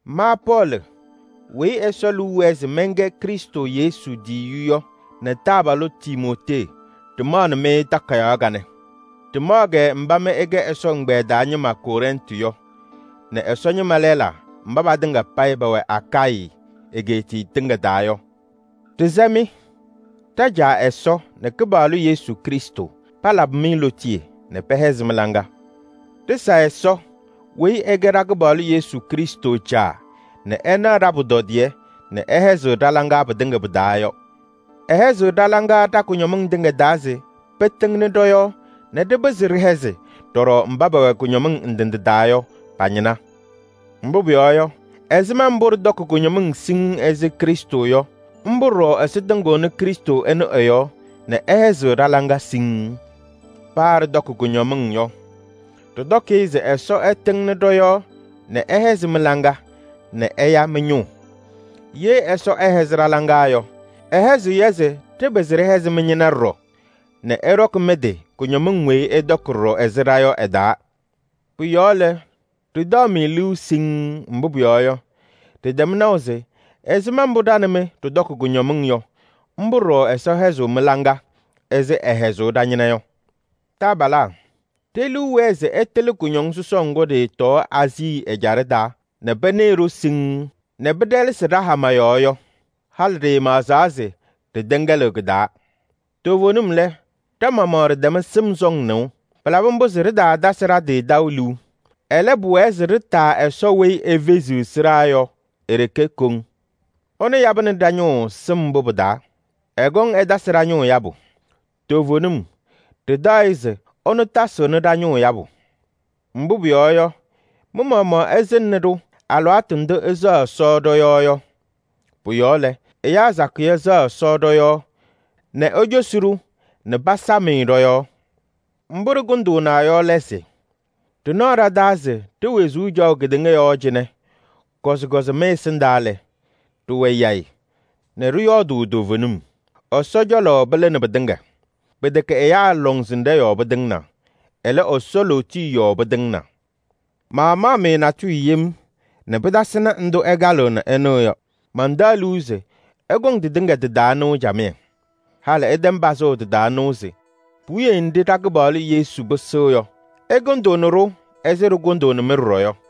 Ma Pɔɔlɩ weyi Ɛsɔ liu wɛɛ se mɛnkɛ Krɩstʋ Yesu tiyiyu yɔ nɛ taabalʋ Timootee ɖɩmaɣnɩ-mɩ takayaɣ kanɛ. Ɖɩmaɣ-kɛ mba mɩ ɩkɛ Ɛsɔ ɛgbɛyɛ taa ñɩma Kɔrɛntɩ yɔ nɛ Ɛsɔ ñɩma lɛlaa mba patɩŋa payɩ pɛwɛ Akayɩ egeetiye tɩŋa taa yɔ. Ɖɩsɛ-mɩ: ɖa-Caa Ɛsɔ nɛ Kɩpaɣlʋ Yesu Krɩstʋ palabɩ-mɩ lootiye nɛ pɛhɛzɩ mɩ-laŋa. Ɖɩsa Ɛsɔ weyi ɛkɛ ɖa-Kɩpaɣlʋ Yesu Krɩstʋ Caa nɛ ɛnaɣ ɖa-pʋtɔdɩyɛ nɛ ɛhɛzɩɣ ɖa-laŋa pɩtɩŋa pɩ-taa yɔ. Ɛhɛzɩɣ ɖa-laŋa ɖa-kʋñɔmɩŋ tɩŋa taa se pɩtɩŋnɩ ɖɔ-yɔɔ nɛ ɖɩpɩzɩ ɖɩhɛzɩ ɖɔɖɔ mba pɛwɛ kʋñɔmɩŋ ndɩ ndɩ taa yɔ pa-ñɩna. Mbʋ pʋyɔɔ yɔ, ɛzɩma mbʋ ɖɩtɔkɩ kʋñɔmɩŋ siŋŋ ɛzɩ Krɩstʋ yɔ, mbʋ ɖɔɖɔ Ɛsɔ tɩŋɩɣnɩ Krɩstʋ ɛnʋ ɛ-yɔɔ nɛ ɛhɛzɩɣ ɖa-laŋa siŋŋ. Paa ɖɩtɔkɩ kʋñɔmɩŋ yɔ, ɖɩtɔkɩ-ɩ se Ɛsɔ ɛtɩŋnɩ ɖɔ-yɔɔ nɛ ɛhɛzɩ mɩ-laŋa nɛ ɛya mɩ-ñʋʋ. Ye Ɛsɔ ɛhɛzɩɣ ɖa-laŋa yɔ, ɛhɛzɩɣ-yɛ se ɖɩpɩzɩ ɖɩhɛzɩ mɩ-ñɩna ɖɔɖɔ nɛ ɩɖɔkɩ mɩ-tɩ kʋñɔmɩŋ weyi ɩtɔkɩ ɖɔɖɔ ɛzɩ ɖa yɔ ɩ-taa. Pʋ-yɔɔ lɛ, ɖɩtaɣ-mɩ liu siŋŋ, mbʋ pʋyɔɔ yɔ, ɖɩtɛm naʋ se ɛzɩma mbʋ ɖa nɛ mɩ ɖɩtɔkɩ kʋñɔmɩŋ yɔ, mbʋ ɖɔɖɔ Ɛsɔ hɛzɩɣ mɩ-laŋa ɛzɩ ɛhɛzʋʋ ɖa-ñɩna yɔ. Taabalaa, ɖe-liu wɛɛ se ɩtɩlɩ kʋñɔŋ sɔsɔʋ ŋgʋ ɖɩɩtɔɔ Aazii ɛjaɖɛ taa nɛ pɩnɩɩ-ɖʋ siŋŋ nɛ pɩɖɛlɛsɩ ɖa-hama yɔɔ yɔ. Halɩ ɖɩɩmaɣzaa se ɖɩtɛŋɛlɩɣ kɩ-taa. Toovenim lɛ, ɖa-maɣmaɣ ɖɩtɛm sɩm sɔŋ nɩʋ. Pɩlabɩ mbʋ se ɖɩtaatasɩ ɖa-tɩ taʋ liu. Ɛlɛ, pʋwɛɛ se ɖɩtaa Ɛsɔ weyi efeziɣ sɩɖaa yɔ e-ɖeke kɔŋ. Ɛnʋ yabɩnɩ ɖa-ñʋʋ sɩm mbʋ pɩ-taa. Ɛkɔŋ ɛtasɩ ɖa-ñʋʋ yabʋ. Toovenim ɖɩtaɣ-ɩ se ɛnʋ tasɩɣnɩ ɖa-ñʋʋ yabʋ. Mbʋ pʋyɔɔ yɔ, mɩ-maɣmaɣ ɩsɩŋnɩ-ɖʋ alɩwaatʋ ndʋ ɩsɛɣ Ɛsɔ ɖɔ-yɔɔ yɔ. Pʋ-yɔɔ lɛ, ɛyaa sakɩyɛ sɛɣ Ɛsɔ ɖɔ-yɔɔ nɛ ecosi-ɖʋ nɛ pasam-ɩ ɖɔ-yɔɔ. Mbʋ ɖɩkʋndʋʋna yɔ lɛ se: ɖɩnaɣ ɖa-taa se ɖe-wezuu caɣʋ kedeŋa yɔɔ cɩnɛ, kɔzɩkɔzɩ mɩ-ɛsɩndaa lɛ, ɖɩwɛ yayɩ nɛ ɖɩyɔɔdʋʋ toovenim. Ɛsɔ cɔlɔ pɩlɩnɩ pɩtɩŋa. Pɩtɛkɛ ɛyaa lɔŋsɩnɖɛ yɔɔ pɩtɩŋnaa. Ɛlɛ, Ɛsɔ lootiye yɔɔ pɩtɩŋnaa. Maamaɣ-mɩ natʋyʋ yem nɛ pɩtasɩnɩ ndʋ ɩkalɩɣ nɛ ɩnɩɣ yɔ. Mantaɣ liu se ɩkɔŋ tɩtɩŋa tɩ-taa nɩʋ camɩyɛ. Halɩ ɩtɛm pazʋʋ tɩ-taa nɩʋ se puwiye nɖɩ ɖa-Kɩpaɣlʋ Yesu pɩsɩɣ yɔ, ɩkʋndʋʋnɩ-ɖʋ ɛzɩ ɖɩkʋndʋʋnɩ-mɩ ɖɔɖɔ yɔ.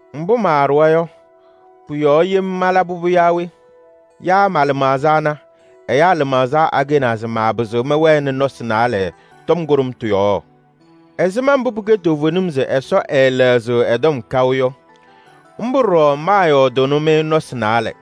Mbʋ maaɖʋwa yɔ, pʋ-yɔɔ yem malaba yaa we? Yaa ma-lɩmaɣza ana, ɛyaa lɩmaɣza akɛnaa se maapɩzɩ mɔyɔɔdɩ nɔsɩ naalɛ tɔm kʋɖʋmtʋ yɔɔ? Ɛzɩma mbʋ pɩkɛ toovenim se Ɛsɔ ɛɛlɛɣzɩɣ ɛ-tɔm kaʋ yɔ, mbʋ ɖɔɖɔ maayɔɔdʋʋnɩ-mɩ nɔsɩ naalɛ.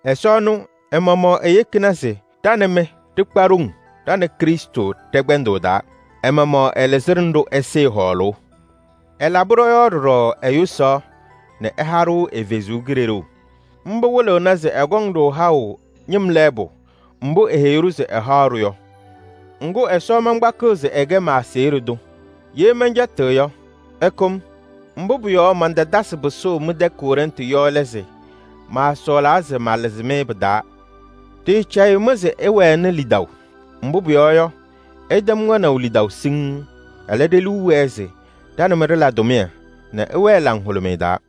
Ɛsɔ ɛnʋ ɛ-maɣmaɣ eyekini se ɖa nɛ mɩ ɖɩkpa ɖoŋ ɖa nɛ Krɩstʋ ɖɛ-kpɛndʋʋ taa. Ɛ-maɣmaɣ ɛlɩzɩnɩ-ɖʋ ɛsɩɩ hɔɔlʋʋ. Ɛlabɩ ɖɔ-yɔɔ ɖɔɖɔ ɛ-yʋsaɣ nɛ ɛha-ɖʋ ɛ-Kalɩzaɣ. Mbʋ wɩlɩɣna se ɛkɔŋ-ɖʋ haʋ ñɩm lɛɛbʋ mbʋ eheyi-ɖʋ se ɛhaɣ-ɖʋ yɔ. Ŋgʋ, Ɛsɔ mankpakɩɣ se ɛkɛ ma-aseɣɖe tʋ, ye mɛncɛtɩɣ yɔ, ɛkʋ-m. Mbʋ pʋ-yɔɔ mantatasɩ pɩsʋʋ mɩ-tɛ Kɔrɛntɩ yɔ lɛ se: maasɔɔlaa se malɩzɩ-mɩ pɩ-taa. Ɖɩɩcɛyɩɣ-mɩ se ɩwɛnɩ lidaʋ. Mbʋ pʋyɔɔ yɔ, ɩtɛm wɛnaʋ lidaʋ siŋŋ. Ɛlɛ, ɖe-liu wɛɛ se ɖa nɛ mɩ ɖɩla tʋmɩyɛ nɛ ɩwɛɛ laŋhʋlʋmɩyɛ taa.